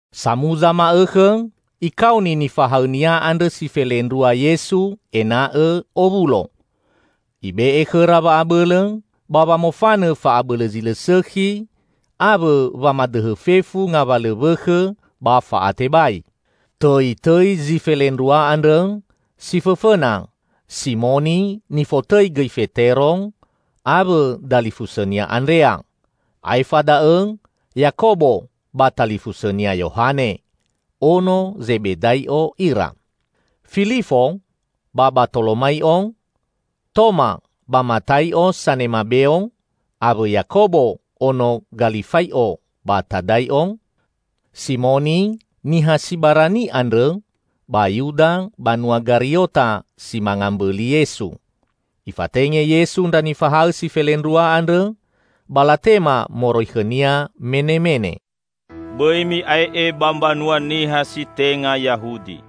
Samuza ma'õkhõ Ikaoni nifahaõ-Nia andrõ si felendrua Yesu ena'õ owulo. Ibe'e khõra wa'abõlõ ba wamofanõ fa'abõlõ zi lõ sõkhi awõ wamadõhõ fefu ngawalõ wõkhõ ba fa'atebai. Tõitõi zi felendrua andrõ: si fõfõna, Simoni (nifotõi gõi Fetero), awõ dalifusõnia Andrea, aefa da'õ Yakobo ba talifusõnia Yohane, ono Zebedai'o ira. Filifo ba Batolomai'o, Toma ba Matai'o sanema beo, awõ Yakobo ono Galifai'o ba Tadai'o, Simoni niha si barani andrõ ba Yuda banua Gariota si manga mbõli Yesu. Ifatenge Yesu ndra nifahaõ si felendrua andrõ, ba latema moroi khõ-Nia menemene, "Bõi mi'ae'e ba mbanua niha si tenga Yahudi.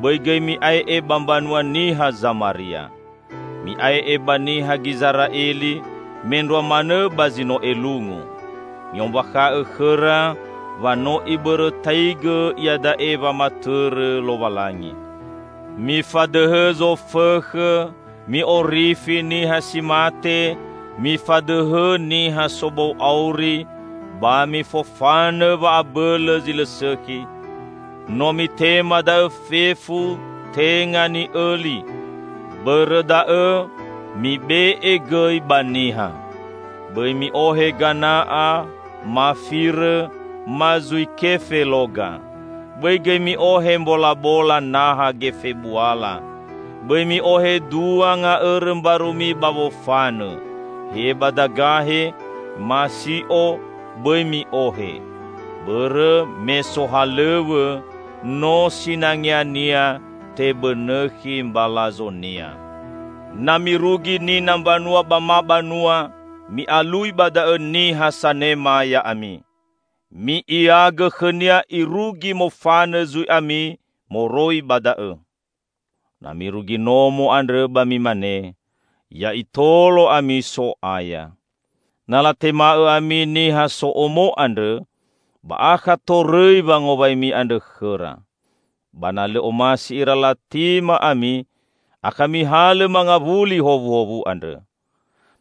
Bõi gõi mi'ae'e ba mbanua niha Zamaria. Mi'ae'e ba niha Gizera'eli, mendrua manõ ba zi no elungu. Mi'ombakha'õ khõra wa no Ibõrõtaigõ iada'e wamatõrõ Lowalangi. Mifadõhõ zofõkhõ; mi'orifi niha si mate; mifadõhõ niha sobou auri; ba mifofanõ wa'abõlõ zi lõ sõkhi. No mitema da'õ fefu tenga ni'õli. Bõrõ da'õ, mibe'e gõi ba niha. Bõi mi'ohe gana'a, ma firõ, ma zui kefe loga. Bõi gõi mi'ohe mbolabola naha gefe buala. Bõi mi'ohe dua nga'õrõ mbarumi ba wofanõ, he badagahe ma si'o bõi mi'ohe. Bõrõ me sohalõw̃õ, no sinangeania tebõnõkhi mbalazonia. Na mirugi nina mbanua ba ma banua, mi'alui ba da'õ niha sanema ya'ami. Mi'iagõ khõnia irugi mofanõ zui ami moroi ba da'õ. Na mirugi nomo andrõ ba mimane, 'Ya Itolo ami So'aya.' Na latema'õ ami niha so'omo andrõ, ba akha torõi wangowaimi andrõ khõra. Ba na lõ omasi ira latema ami, akha mihalõ mangawuli howuhowu andrõ.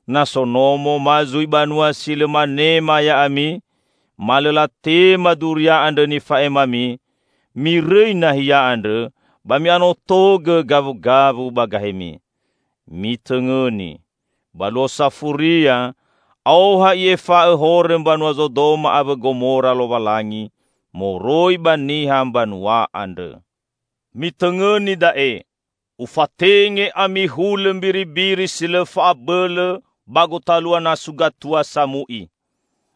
Na so nomo ma zui banua si lõ manema ya'ami ma lõ latema duria andrõ nifa'emami, mirõi nahia andrõ ba mi'anotogõ gawugawu ba gahemi. Mitõngõni! Ba Luo Safuria, aoha I'efa'õ horõ mbanua Zodoma awõ Gomora Lowalangi moroi ba niha mbanua andrõ!" "Mitõngõni da'e: Ufatenge ami hulõ mbiribiri si lõ fa'abõlõ ba gotalua nasu gatua samu'i.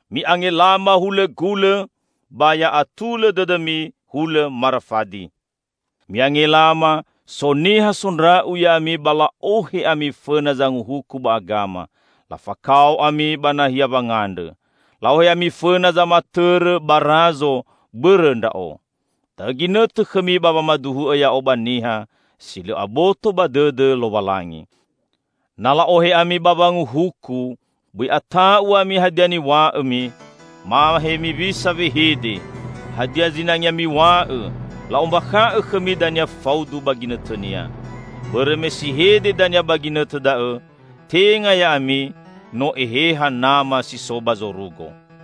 Mi'angelama hulõ gulõ ba ya atulõ dõdõmi hulõ marafadi. Mi'angelama, so niha sondra'u ya'ami ba la'ohe ami fõna zanguhuku ba agama. Lafakao ami ba nahia wangandrõ. La'ohe ami fõna zamatõrõ ba razo bõrõ Ndra'o. Da'õ ginõtõ khõmi ba wamaduhu'õ Ya'o ba niha si lõ aboto ba dõdõ Lowalangi. Na la'ohe ami ba wanguhuku, bõi ata'u ami hadia niw̃a'õmi, ma hemiwisa wehede. Hadia zinangea miw̃a'õ, la'ombakha'õ khõmi dania faudu ba ginõtõnia. Bõrõ me si hede dania ba ginõtõ da'õ tenga ya'ami, no Eheha Nama si so ba zorugo.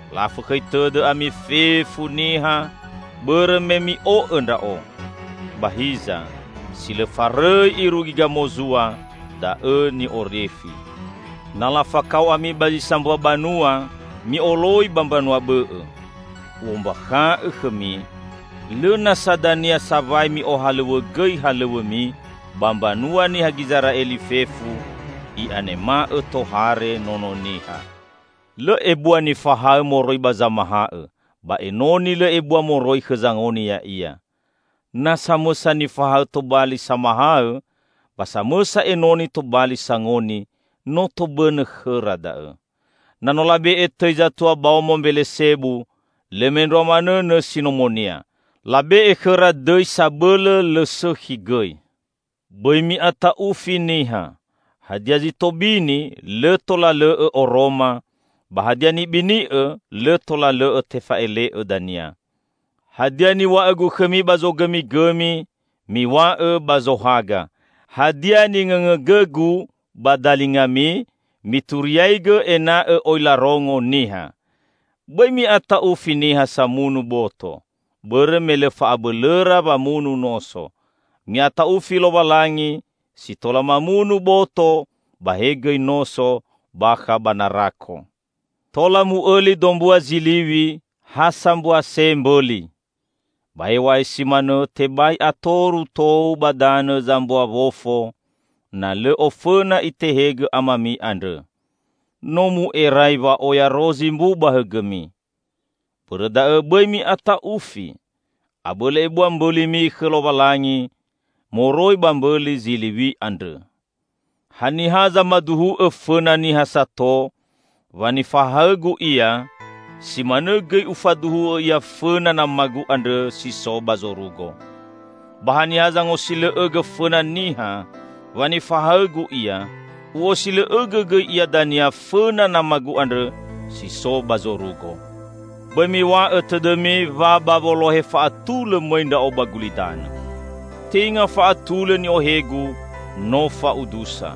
La'afõkhõi tõdõ ami fefu niha bõrõ me mi'o'õ Ndra'o. Ba hiza, si lõ farõi irugi gamozua, da'õ ni'orifi. Na lafakao ami ba zi sambua banua, mi'oloi ba mbanua bõ'õ. U'ombakha'õ khõmi: Lõ nasa dania sawai mi'ohalõw̃õgõi halõw̃õmi ba mbanua niha Gizera'eli fefu, i'anema'õ tohare Nono Niha. Lõ ebua nifaha'õ moroi ba zamaha'õ, ba enoni lõ ebua moroi khõ zangoni ya'ia. Na samõsa nifahaõ tobali samahaõ ba samõsa enoni tobali sangoni, no tobõnõ khõra da'õ. Na no labe'e tõi zatua baomo Mbelesebu, lõ mendrua manõ nõsi nomonia. Labe'e khõra dõi sabõlõ lõ sõkhi gõi!" "Bõi mi'ata'ufi niha. Hadia zi tobini, lõ tola lõ'õ oroma, ba hadia nibini'õ lõ tola lõ'õ tefa'ele'õ dania. Hadia niw̃a'õ-Gu khõmi ba zogõmigõmi, miw̃a'õ ba zohaga. Hadia ningõngõgõ-Gu ba dalingami, mituriaigõ ena'õ oi larongo niha! Bõi mi'ata'ufi niha samunu boto, bõrõ me lõ fa'abõlõra wamunu noso. Mi'ata'ufi Lowalangi si tola mamunu boto ba he gõi noso bakha ba narako. Tola mu'õli dombua ziliw̃i, ha sambua se mbõli. Ba hew̃a'ae si manõ tebai atoru tou ba danõ zambua wofo na lõ ofõna Itehegõ Amami andrõ. No mu'erai wa'oya rozi mbu ba hõgõmi. Bõrõ da'õ bõi mi'ata'ufi! Abõlõ ebua mbõlimi khõ Lowalangi moroi ba mbõli ziliw̃i andrõ!" "Haniha zamaduhu'õ fõna niha sato, wa nifahaõ-Gu ia, si manõ gõi Ufaduhu'õ ia fõna nama-Gu andrõ si so ba zorugo. Ba haniha zangosilõ'õgõ fõna niha wa nifahaõ-Gu ia, U'osilõ'õgõ gõi ia dania fõna Nama-Gu andrõ si so ba zorugo." "Bõi miw̃a'õ tõdõmi wa ba wolohe fa'atulõ mõi Ndra'o ba gulidanõ. Tenga fa'atulõ ni'ohe-Gu no fa'udusa.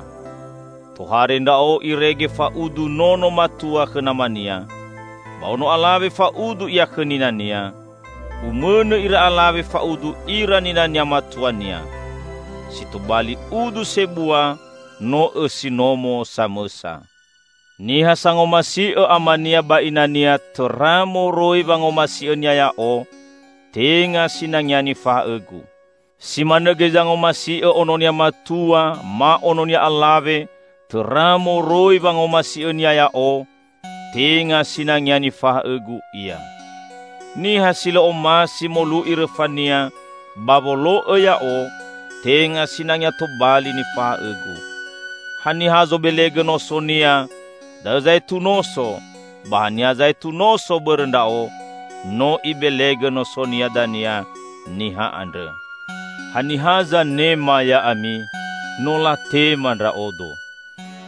Tohare Ndra'o irege fa'udu nono matua khõ namania, ba ono alawe fa'udu ia khõ ninania, umõnõ ira alawe fa'udu ira ninania matuania. Si tobali udu sebua no õsi nomo samõsa. Niha sangomasi'õ amania ba inania tõra moroi wangomasi'õnia Ya'o, tenga sinangea nifahaõ-Gu. Si manõ gõi zangomasi'õ ononia matua ma ononia alawe tõra moroi wangomasi'õnia Ya'o, tenga sinangea nifahaõ-Gu ia. Niha si lõ omasi molu'i rõfania ba wolo'õ Ya'o tenga sinangea tobali nifahaõ-Gu. Haniha zobelegõ nosonia, da'õ zaetu noso, ba haniha zaetu noso bõrõ Ndra'o, no ibelegõ nosonia dania niha andrõ." "Haniha zanema ya'ami, no latema Ndra'odo.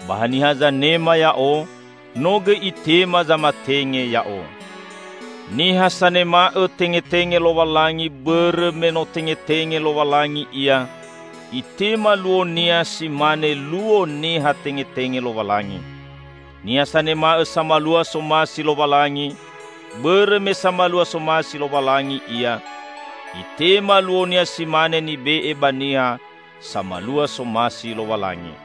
Ba haniha zanema Ya'o, no gõi itema zamatenge Ya'o. Niha sanema'õ tengetenge Lowalangi bõrõ me no tengetenge Lowalangi ia, itema luonia si mane luo niha tengetenge Lowalangi. Niha sanema'õ samalua somasi Lowalangi, bõrõ me samalua somasi Lowalangi ia, itema luonia si mane nibe'e ba niha samalua somasi Lowalangi.